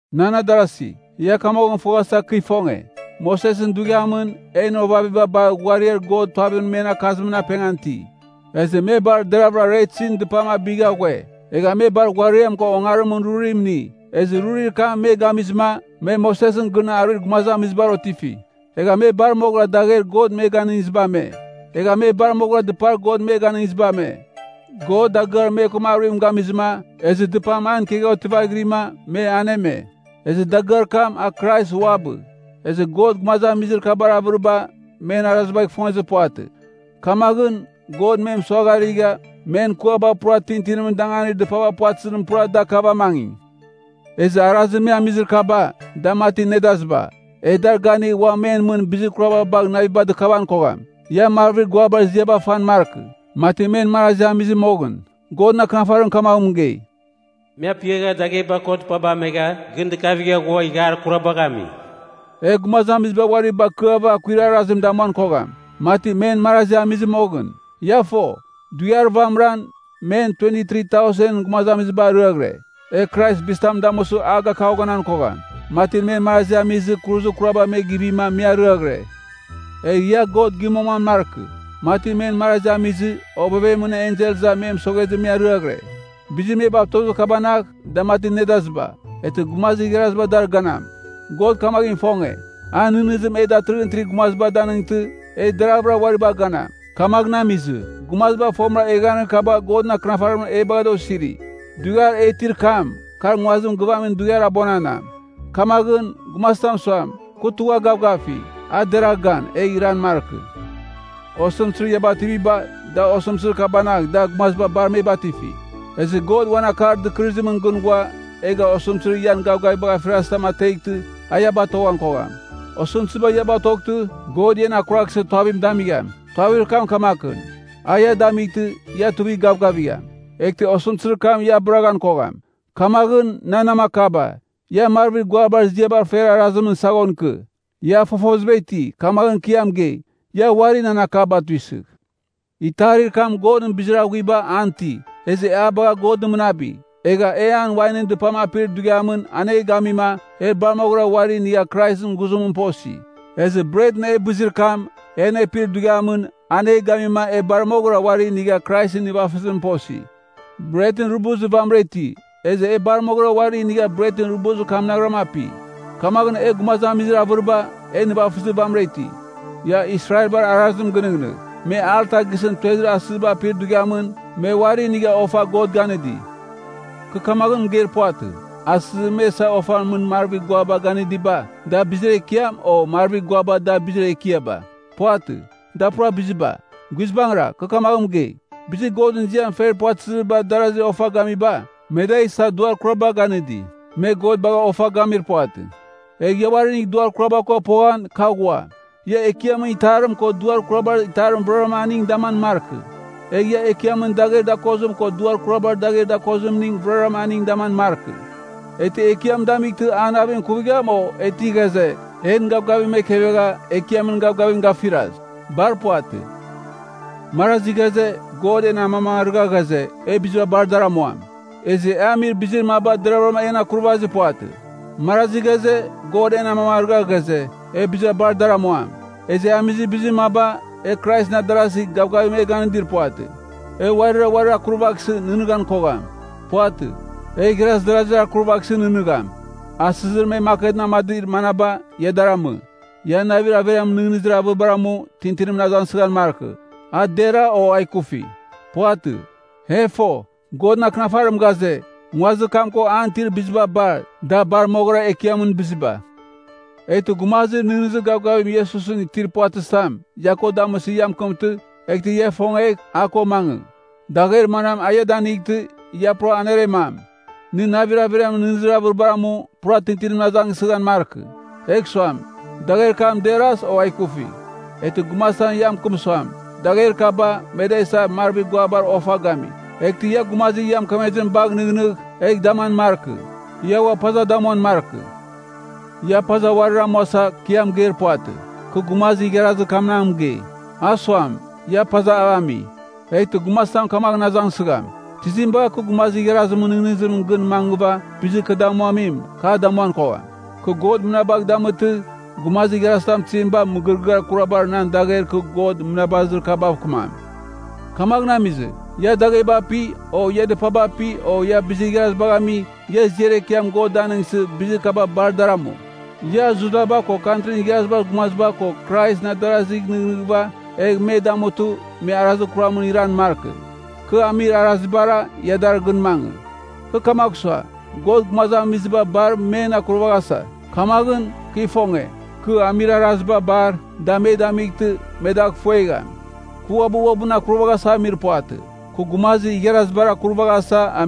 Nan adarasi, ia kamaghɨn foghasa kɨ ifonge. Mosesɨn dughiamɨn, en ovaviba bar ghuariar God tuavimɨn men akakazimɨn apengan iti. Ezɨ me bar deravɨra Retsin Dɨpam abigha ghue. Egha me bar ghuariam ko ongarimɨn rurim ini, ezɨ rurir kam me gamizɨma, me Mosesɨn gɨn aruir gumazamizibar otifi. Egha me bar moghɨra dagher God me ganɨngiziba ame. Egha me bar moghɨra dɨpar God me ganɨngiziba ame. God dagɨar me ko aruim gamizɨma, ezɨ dɨpam an ikegha otivaghirima, me aneme. Ezɨ dagɨar kam, a Krais uabɨ. Ezɨ God gumazamizir kabar avɨriba, men arazibagh ifongezir puvatɨ. Kamaghɨn, God me mɨsuagharigha, men kuaba pura tintinimɨn danganir dɨpaba puvatɨzimɨn pura da kavamangi. Ezɨ arazir me amizir kaba, da mati nedaziba, e dar ganigh ua men mɨn bizir kuraba bagh naviba dɨkavan kogham. Ia marvir guabar ziaba fan markɨ, mati men marazi amizɨ moghɨn. Godɨn Akɨnafarim kamaghɨn mɨgei, “Me apiagha dagheba ko dɨpaba amegha, gɨn dɨkavigha ghua ighiar kurabagh ami.” E gumazamiziba uari bakɨava akuir arazim damuan kogham, mati men marazi amizɨ moghɨn. Ia fo, dughiar vamɨran, men 23,000ɨn gumazamiziba ariaghɨre. E Krais bizitam damusɨ a gakaghonan kogham, mati men marazi amizɨ, kuruzir kuraba me givima me ariaghɨre. Egh ia God gimoman markɨ, mati men marazi amizɨ, Ovevemɨn Ensel iza me mɨsoghezɨ me ariaghɨre. Bizir me batozir kabanagh, da mati nedaziba, eghtɨ gumazir igharaziba dar ganam. God kamaghɨn ifonge, a nɨghnɨzim e datɨrɨghɨn itir gumaziba danightɨ, e deraghvɨra uari bagh ganam. Kamaghɨn amizɨ, gumaziba fomɨra eghaghanir kaba Godɨn Akɨnafarimɨn e bagha da osiri. Dughiar e itir kam, kar nguazim gɨvamim dughiar abuananam. Kamaghɨn, gumazitam suam, kɨ tugha gavgafi, a deragh gan, egh iran markɨ. Osɨmtɨzir ia bativiba, da osɨmtɨzir kabanagh da gumaziba bar me batifi. Ezɨ God uan akar dɨkɨrɨzimɨn gɨn ghua, egh osɨmtɨzir ian gavgavibagh afirazɨ tam ateghtɨ, a ia batoghan kogham. Osɨmtɨziba ia batoghtɨ, God ian akuraghsɨ tuavim damigham. Tuavir kam kamakɨn: a ia damightɨ, ia tuivigh gavgavigham, eghtɨ osɨmtɨzir kam ia abɨraghan kogham. Kamaghɨn, nan namakaba, ia marvir guabar ziaba fer arazimɨn saghon ikɨ. Ia fofoziba iti, kamaghɨn kɨ ia mɨgei. Ia uari nan akaba tuisɨgh. Itarir kam Godɨn bizir aghuiba an iti, ezɨ e a bagha God mɨnabi, egha e an wainɨn dɨpam apir dughiamɨn an e gamima, e bar moghɨra uari inigha Kraisɨn ghuzimɨn posi. Ezɨ bretɨn e bɨzir kam, e anepir dughiamɨn, an e gamima, e bar moghɨra uari inigha Kraisɨn nivafɨzimɨn posi. Bretɨn rubuzir vamɨra iti, ezɨ e bar moghɨra uari inigha bretɨn rubuzir kamnaghram api, kamaghɨn e gumazamizir avɨriba, e nivafɨzir vamɨra iti. Ia Israelbar arazim ginɨghnɨgh. Me alta gisɨn tuezir asɨziba apir dughiamɨn, me uari inigha ofa God ganɨdi. Kɨ kamaghɨn mɨgeir puvatɨ, asɨzir me isa ofan mɨn marvir guaba ganɨdiba, da bizir ekiam, o marvir guaba da bizir ekiaba. Puvatɨ, da pura biziba. Guizbangɨra, kɨ kamaghɨn mɨgei, bizir Godɨn ziam fer puvatɨzir darazi ofa gamiba, me da isa duar kuraba ganɨdi. Me God bagha ofa gamir puvatɨ. Egh ia uari inigh duar kuraba ko poghan, kɨ aghua. Ia Ekiamɨn itarim ko duar kurabar itarimning vɨraram aningɨn daman markɨ. Egh ia Ekiamɨn dagher dakozim ko duar kurabar dagher dakozimning vɨraram aningɨn daman markɨ. E ti Ekiam damightɨ, an navim ikuvigham? O, e ti ghaze, en gavgavim ekevegha, Ekiamɨn gavgavim gafiras? Bar puvatɨ! Marazi ghaze, “God en amamangarɨgha ghaze, e biziba bar dar amuam.” Ezɨ e amir bizir maba deravɨra en akurvazir puvatɨ. Marazi ghaze, “God en amamangarɨgha ghaze, e biziba bar dar amuam.” Ezɨ e amir bizir maba, e Kraisɨn adarazi, gavgavim e ganɨdir puvatɨ. E uarira uarir akurvaghsɨ, nɨghnɨghan kogham. Puvatɨ, e igharaz darazir akurvaghsɨ nɨghnɨgham. Asɨzir me maketɨn amadir manaba, ia dar amɨ. Ia navir averiamɨn nɨghnɨzir avɨribar amu, tintinimɨn azangsɨghan markɨ, a deragh o a ikufi. Puvatɨ. E fo, Godɨn Akɨnafarim ghaze, “Nguazir kam ko an itir biziba bar, da bar moghɨra Ekiamɨn biziba.” Eghtɨ gumazir nɨghnɨzir gavgavim Iesusɨn itir puvatɨzitam, ia ko damɨsɨ ia mɨkɨmtɨ, eghtɨ ia ifongegh, a ko mangɨ. Dagher manam a ia danightɨ, ia pura aneremam. Nɨ navir averiamɨn nɨghnɨzir avɨribar amu, pura tintinimɨn azangsɨghan markɨ egh suam, dagher kam deras, o a ikufi. Eghtɨ gumazitam ia mɨkɨm suam, “Dagher kaba, me da isa, marvir guabar ofa gami.” Eghtɨ ia gumazir ia mɨkemezim bagh nɨghnɨgh, egh daman markɨ. Ia ua paza damuan markɨ. Ia paza uarir amuasa, kɨ ia mɨgeir puvatɨ. Kɨ gumazir igharazir kamnagh mɨgei, A ua suam, ia pazav ami. Eghtɨ gumazitam kamaghɨn azangsɨgham, tizim bagh kɨ gumazir igharazimɨn nɨghnɨzimɨn gɨn mangɨva, bizir kɨ damuamim, kɨ a damuan kogham? Kɨ God mɨnabagh damɨtɨ, gumazir igharazitam tizim bagh mɨgɨrɨgɨar kurabar nan dagher kɨ God mɨnabazir kabav kɨmam? Kamaghɨn amizɨ, ia dagheba api, o ia dɨpaba api, o ia bizir igharazibagh ami, ia ziar ekiam God danɨngsɨ, bizir kaba bar dar amu. Ia Judaba ko Kantrin Igharazibar Gumaziba ko Kraisɨn adarazigh nɨghnɨghɨva, egh me damutɨ, me arazir kuramɨn iran markɨ. Kɨ amir arazibara, ia dar gɨn mangɨ. Kɨ kamagh sua, God gumazamiziba bar men akurvaghasa. Kamaghɨn, kɨ ifonge, kɨ amir araziba bar, da me damightɨ, me dagh ifuegham. Kɨ uabɨ uabɨn akurvaghasa amir puvatɨ, kɨ gumazir igharazibar akuravaghasa